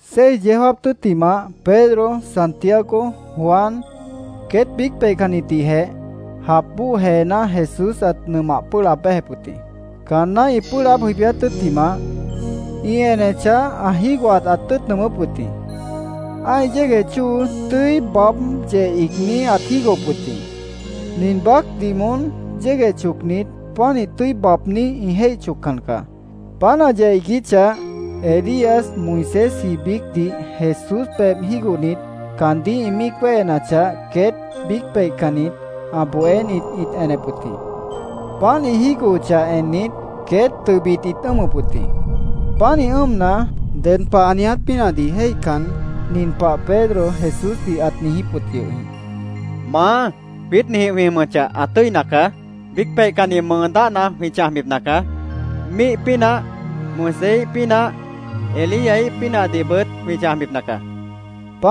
Seis yeó jáap tʉ́ttimah Pedro, Santiago, Juan, queét biíc peihcannitdihjeh jap bóo jeená Jesús ãt nʉmah pʉ́ʉh laab béjep wʉt jĩ. Caanná ĩ pʉ́ʉh laáb jʉibíát tʉ́ttimah, ĩ enechah, ã jígohat ãt tʉ́ʉt nʉʉmʉ́p wʉt jĩ. Ã́ih yégueh chóo tʉ́i baáb yeh iigní ãt jígohop wʉt jĩ. Nin baácdih moón yégueh chocnit, pánih tʉ́i baabní ĩ jéih choccan caá. Páant ã yeh iiguíchah, Elías, Moisésji biícdih Jesús pebh jígohnit, caandíh ĩ míic wéhenachah, queét biíc peihcannit ã bohénit ĩt enep wʉt jĩ. Páant ĩ jígohochah ennit, queét tʉbit ĩt ʉ́ʉmʉp wʉt jĩ. Pánih ʉ́ʉmna, ded pah ã niiját pínahdih jéihcan, nin pah Pedro Jesúsdih ãt niijíp wʉt yʉh jĩ: —¡Maá, jwiít ninjĩh jwĩ jʉmʉchah, ã tʉ́ina caá! Biíc peihcanni mʉʉ dáhna jwĩ chãjbipna caá. Míih pínah, Moiséíh pínah, Elíaíh pínahdihbʉt jwĩ chãjbipna caá, ãt niijíp wʉt yʉh jĩ.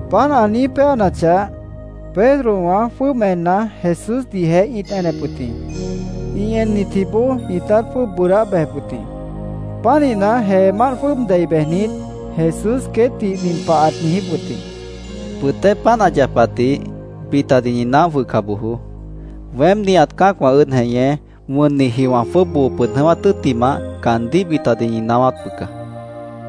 Páant ã niíj péanachah, Pedrowã jwʉ́ʉb enna, Jesúsdihjeh ĩt enep wʉt jĩ. Ĩ ennitjiboó ĩtát jwʉ́ʉb bʉʉdáh bejep wʉt jĩ. Pánihna, jeemánt jwʉ́ʉb dei bejnit, Jesús queétdih nin pah ãt niijíp wʉt jĩ: “Bʉtéh páant ã yapatdih bitadih ñi naóh jwʉhca bojoó. Weém, nihat cã́acwã ʉ́ʉd jeñé, wʉnniji wã jwʉ́ʉb boo pʉd jʉ̃ʉ́wát tʉ́ttimah, caandíh bitadih ñi naáwáp bʉca”, ãt niijíp wʉt jĩ.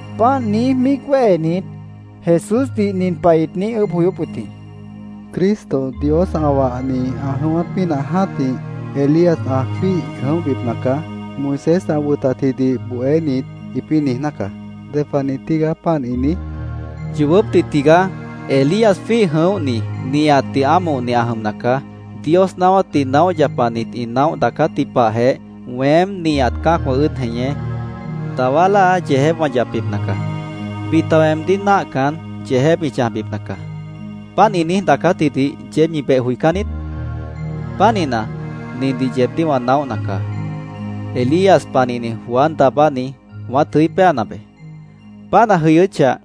Páant niíj míic wéhenit, Jesúsdih nin pah ĩt niíj ʉʉ́bh joyóp wʉt jĩ: —‘Cristo, Dios ã wahni, ã jʉ̃ʉ́wát pínah jã́tih, Elías ã jwíih jʉ̃óhbipna caá’, Moisés ã wʉtatjidih bohénit ĩpĩ́ niijná caá. ¿Ded pah niij tígaá páant ĩ niíj? caandíh ĩt niijíp wʉt jĩ. —Yoobópdih tigaá. Elías jwíih jʉ̃óhni, nihatdih ámohni ã jʉmna caá. Dios naáwátdih naóh yapanit ĩ naóh daacátji pahjeh, weém, nihat cã́acwã ʉ́ʉd jeñé, dawá láa yeejép wã yapbipna caá. Bita weemdíh náahcan, yeejép ĩ chãjbipna caá. ¿Páant ĩ niíj daacátjidih yeéb ñi beh joicán niít? Pánihna, nindih yeebdíh wã naóhna caá: Elías panihni Juan Daabáni wãát jʉí péana beé. Páant ã jʉyʉ́chah,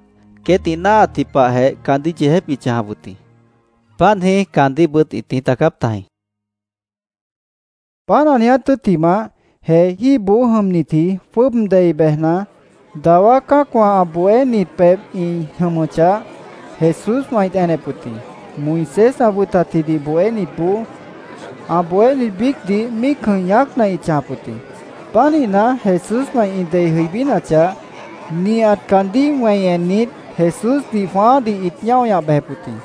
queét ĩ náahatji pahjeh caandíh yeejép ĩt chãjap wʉt jĩ. Páant jĩí caandíhbʉt ĩt niíj daacáp tajĩ, Jesús queétdih ãt niijíp wʉt jĩ. Páant ã niiját tʉ́ttimah, jeejíboó jʉmnitji jwʉ́ʉb dei bejna, dawá cã́acwã ã bohénit pebh ĩ jʉmʉchah, Jesúswã ĩt enep wʉt jĩ. Moisés ã wʉtatjidih bohénitboó ã bohénit biícdih míic jʉ̃ih ñaácna ĩt chãjap wʉt jĩ. Pánihna, Jesúswã ĩ dei jʉibínachah, nihat caandíh wẽi ennit, Jesúsdih jwãáádih ĩt ñáo ñah bejep wʉt jĩ.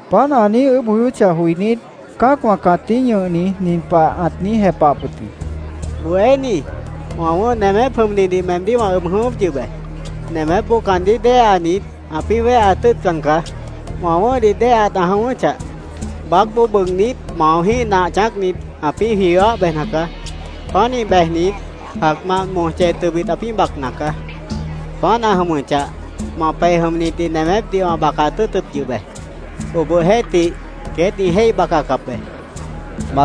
Páant ã niíj ʉʉ́bh joyóchah joinít, cã́acwã cãtíh ñʉhni nin pah ãt niíj jepahap wʉt jĩ: —Bohéní, wã wʉ̃ʉ́h nemép jʉmnidih meemdíh wã ʉb jʉ̃ʉ́wʉ́p yʉh be. Nemépboó caandíh déheanit, ãpĩ́ wéheat tʉ́ʉtcan caá. Wã wʉ̃ʉ́hdih déheat ã jʉ̃ʉ́wʉ́chah, baácboó bʉʉgnít, maojĩ́h nah chãácnit, ãpĩ́ jwiwáh bejna caá. Pánih bejnit, jacmant moj chej tʉbit ãpĩ́ bacna caá. Páant ã jʉmʉchah, ma pej jʉmnitdih nemépdih wã bacaat tʉ́ʉtʉp yʉh be. Obohjeéhtih, queét ĩ jéih bacacap be, Jesúsdih ãt niijíp wʉt jĩ.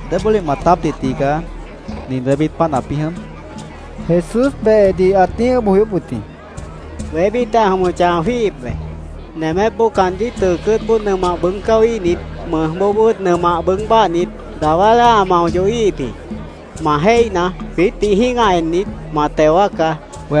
—¿Débólih maatápdih tigaá nin wébít páant ãpĩ́ jʉm? Jesús behedih ãt niíj ʉʉ́bh joyóp wʉt jĩ. —Wébítjeh ã jʉmʉchah, ã jwíihip be. Nemépboó caandíh tʉʉ cʉ́ʉtboó nʉmah bʉʉ́g cáwíhnit, mʉjboobʉ́t nʉmah bʉʉ́g báahnit, dawá láa ã mao yohíhip jĩ. Ma jéihna, jwiítdih jĩ́gah ennit, ma teo wáacá, Jesúsdih ãt niijíp wʉt jĩ.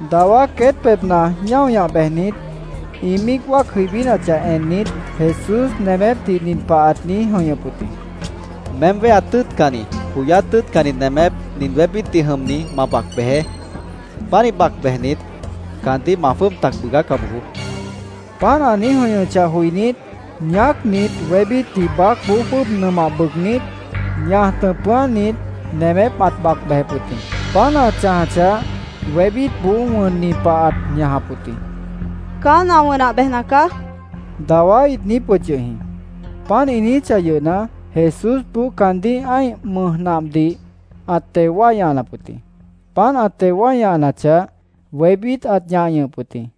Dawá queét pebhna ñáo ñah bejnit, ĩ míic wáac jʉibínachah ennit, Jesús nemépdih nin pah ãt niíj jʉ̃ihñʉp wʉt jĩ: —Meém wéheat tʉ́ʉtcanni, joyát tʉ́ʉtcanni nemép nin wébítdih jʉmni ma bac bejeé. Pánih bac bejnit, caandíh ma jwʉ́ʉb tac bʉʉgáca bojoó, ãt niijíp wʉt jĩ. Páant ã niíj jʉ̃ihñʉchah joinít, ñaácnit, wébítdih baácboó jwʉ́ʉb nʉmah bʉʉgnít, ñaj tʉ̃pʉ́ánit, nemép ãt bac bejep wʉt jĩ. Páant ã chãjachah, wébítboó wʉnni pah ãt ñajap wʉt jĩ. “Caán ã wʉnah bejna caá”, dawá ĩt niijíp wʉt yʉh jĩ. Páant ĩ niijíchah yʉhna, Jesúsboó caandíh ã́ih mʉj nahdih ãt teo wái ñahanap wʉt jĩ. Páant ã teo wái ñahanachah, wébít ãt ñah ñʉhʉp wʉt jĩ.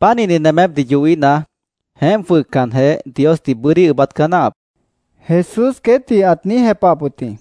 —Pánihni nemépdih yohíhna, jeémp jwʉhcanjeh, Diosdih bʉ́dí ʉʉ́bát caá náahap, Jesús queétdih ãt niíj jepahap wʉt jĩ.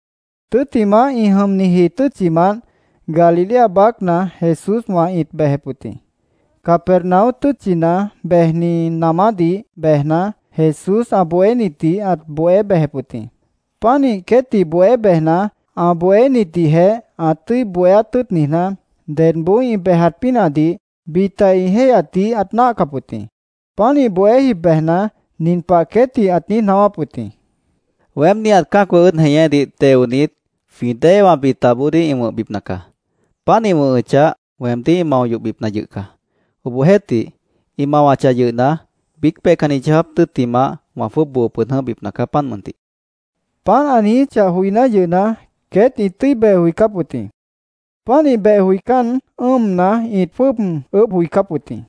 Tʉ́ttimah, ĩ jʉmniji tʉ́tchimant Galilea baácna Jesúswã ĩt bejep wʉt jĩ. Capernaum tʉ́tchina bejni namádih bejna, Jesús ã bohénitdih ãt bohé bejep wʉt jĩ. Pánih queétdih bohé bejna, ã bohénitdihjeh ã tʉ́i bohéát tʉ́ʉt niijná, dedboó ĩ bejat pínahdih bita ĩ jéihyatdih ãt náahcap wʉt jĩ. Pánih bohé jib bejna, nin pah queétdih ãt niíj naáwáp wʉt jĩ: —Weém nihat cã́acwã ʉ́ʉd jeñédih teonit, jwĩ déewã bitaboodíh ĩ wʉ̃hbipna caá. Páant ĩ wʉ̃hʉchah, weemdíh ĩ mao yohbipna yʉh caá. Obohjeéhtih, ĩ mawachah yʉhna, biíc peihcanni yeó jáap tʉ́ttimah, wã jwʉ́ʉb boo pʉd jʉ̃óhbipna caá, páant mʉntih, ãt niijíp wʉt jĩ. Páant ã niijíchah joiná yʉhna, queét ĩt tʉ́i beh joicáp wʉt jĩ. Pánih beh joicán, ʉ́ʉmna, ĩt jwʉ́ʉb ʉʉ́bh joicáp wʉt jĩ.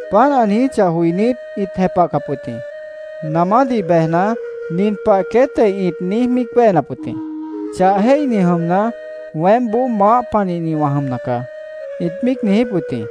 Páant ã niijíchah joinít, ĩt jepahcap wʉt jĩ. Namádih bejna, nin pah queétjeh ĩt niíj míic wéhenap wʉt jĩ: “Chah jéihni jʉmna, weémboó maáh panihni wã jʉmna caá”, ĩt míic niijíp wʉt jĩ.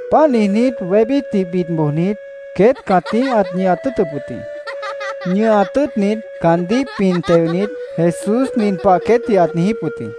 Páant niijnít, wébítdih bid bojnit, queét cãtíh ãt ñʉhat tʉ́ʉtʉp wʉt jĩ. Ñʉhat tʉ́ʉtnit, caandíh pin teonit, Jesús nin pah queétdih ãt niijíp wʉt jĩ: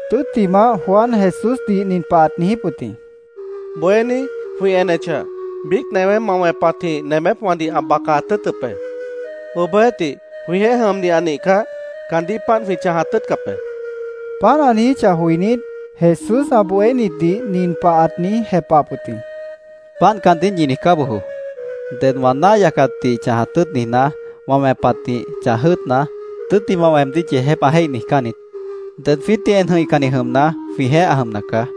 Tʉ́ttimah, Juan Jesúsdih nin pah ãt niijíp wʉt jĩ: —Bohéní, jwĩ enechah, biíc newé ma wẽpatjĩh nemépwãdih ã bacat tʉ́ʉtʉp be. Obohjeéhtih, jwĩjeéh jʉmni ã nihcah, caandíh páant jwĩ chãjat tʉ́ʉtcap be, ãt niijíp wʉt jĩ. Páant ã niijíchah joinít, Jesús ã bohénitdih nin pah ãt niíj jepahap wʉt jĩ: —Páant caandíh ñi niijcá bojoó. Ded wã náah yacatdih chãjat tʉ́ʉt niijná, wã wẽpatjĩh chãj jʉ́ʉtna, tʉ́ttimah weemdíh yeejép ã jéih niijcán niít. Ded jwiítdih en jʉ̃ihcanni jʉmna, jwĩjeéh ã jʉmna caá.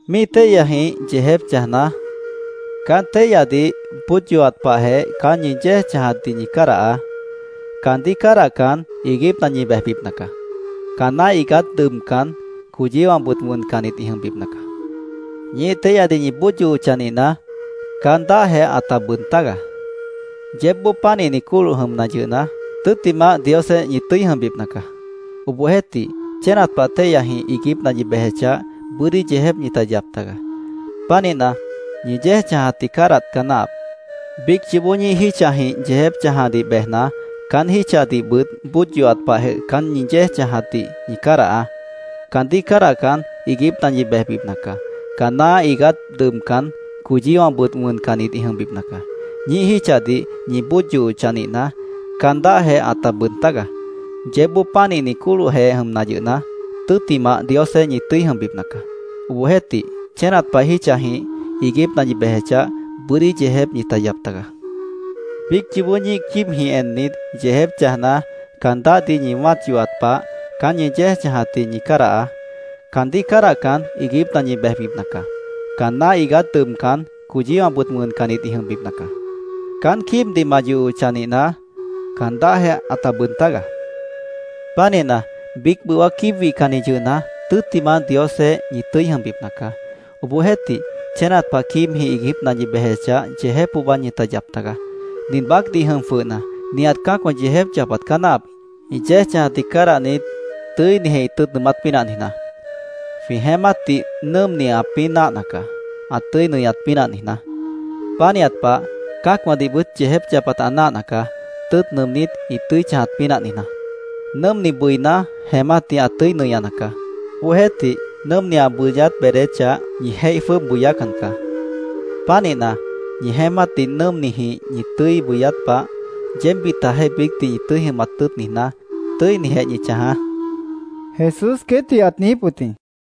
Ñíih téihyajĩh yeejép chãjna, caán téihyadih bóod yohat pahjeh caán ñi yéej chãjatdih ñi cádahaá. Caandíh cádahcan, iiguípna ñi bejbipna caá. Caanná iigát dʉbcan, coyíwãbʉt wʉncannit ĩ jʉmbipna caá. Ñíih téihyadih ñi bóod yohochah nihna, caan dáhjeh ãta bʉʉd tágaá. Yeébboó pánihni cóloh jʉmna yʉhna, tʉ́ttimah Diosjeéh ñi tʉ́i jʉmbipna caá. Obohjeéhtih, chénat pah téihyajĩh iiguípna ñi bejechah, bʉ́dí yeejép ñita yap tagaá. Pánihna, ñi yéej chãjatdih cádahat caá náahap. Biíc yoobó ñíih jítchajĩh yeejép chãjadih bejna, caán jítchadihbʉt bóod yohat pahjeh caán ñi yéej chãjatdih ñi cádahaá. Caandíh cádahcan, iiguípna ñi bejbipna caá. Caanná iigát dʉbcan, coyíwãbʉt wʉncannit ĩ jʉmbipna caá. Ñíih jítchadih ñi bóod yohochah nihna, caan dáhjeh ãta bʉʉd tágaá. Yeébboó pánihni cólohjeh jʉmna yʉhna, tʉ́ttimah Diosjeéh ñi tʉ́i jʉmbipna caá. Obohjeéhtih, chénat pah jítchajĩh iiguípna ñi bejechah, bʉ́dí yeejép ñita yap tagaá. Biíc yoobó ñíih quíibjĩh ennit, yeejép chãjna, caan dáhdih ñi wã́at yohat pah caán ñi yéej chãjatdih ñi cádahaá. Caandíh cádahcan, iiguípna ñi bejbipna caá.Caanná iigát dʉbcan, coyíwãbʉt wʉncannit ĩ jʉmbipna caá.Caán quíibdih ma yohochah nihna, caan dáhjeh ãta bʉʉd tágaá. Pánihna, biíc bʉwá quíib wihcanni yʉhna, tʉ́ttimah Diosjeéh ñi tʉ́i jʉmbipna caá. Obohjeéhtih, chénat pah quíibjĩh iiguípna ñi bejechah, yeejép pohba ñita yap tagaá. “Nin baácdih jʉm jwʉhna, nihat cã́acwã yeejép yapat caá náahap, ĩ yéej chãjatdih cádahnit, tʉ́inijeh ĩ tʉ́ʉt nʉʉmát pínah niijná. Jwĩ jeémátdih nʉ́ʉmni ãpĩ́ náahna caá, ã tʉ́i nʉñat pínah niijná. Pánihat pah, cã́acwãdihbʉt yeejép yapat ã náahna caá, tʉ́ʉt nʉʉmnít, ĩ tʉ́i chãjat pínah niijná. Nʉ́ʉmni bʉiná, jeémátdih ã tʉ́i nʉñana caá. Obohjeéhtih, nʉ́ʉmni ã bʉyát beedéchah, ñi jéih jwʉ́ʉb bʉyácan caá. Pánihna, ñi jeémátdih nʉ́ʉmnijĩh ñi tʉ́i bʉyát pah, yeéb bitajeéh biícdih ñi tʉ́i jʉmat tʉ́ʉt niijná, tʉ́inijeh ñi chãjaá”, Jesús queétdih ãt niijíp wʉt jĩ.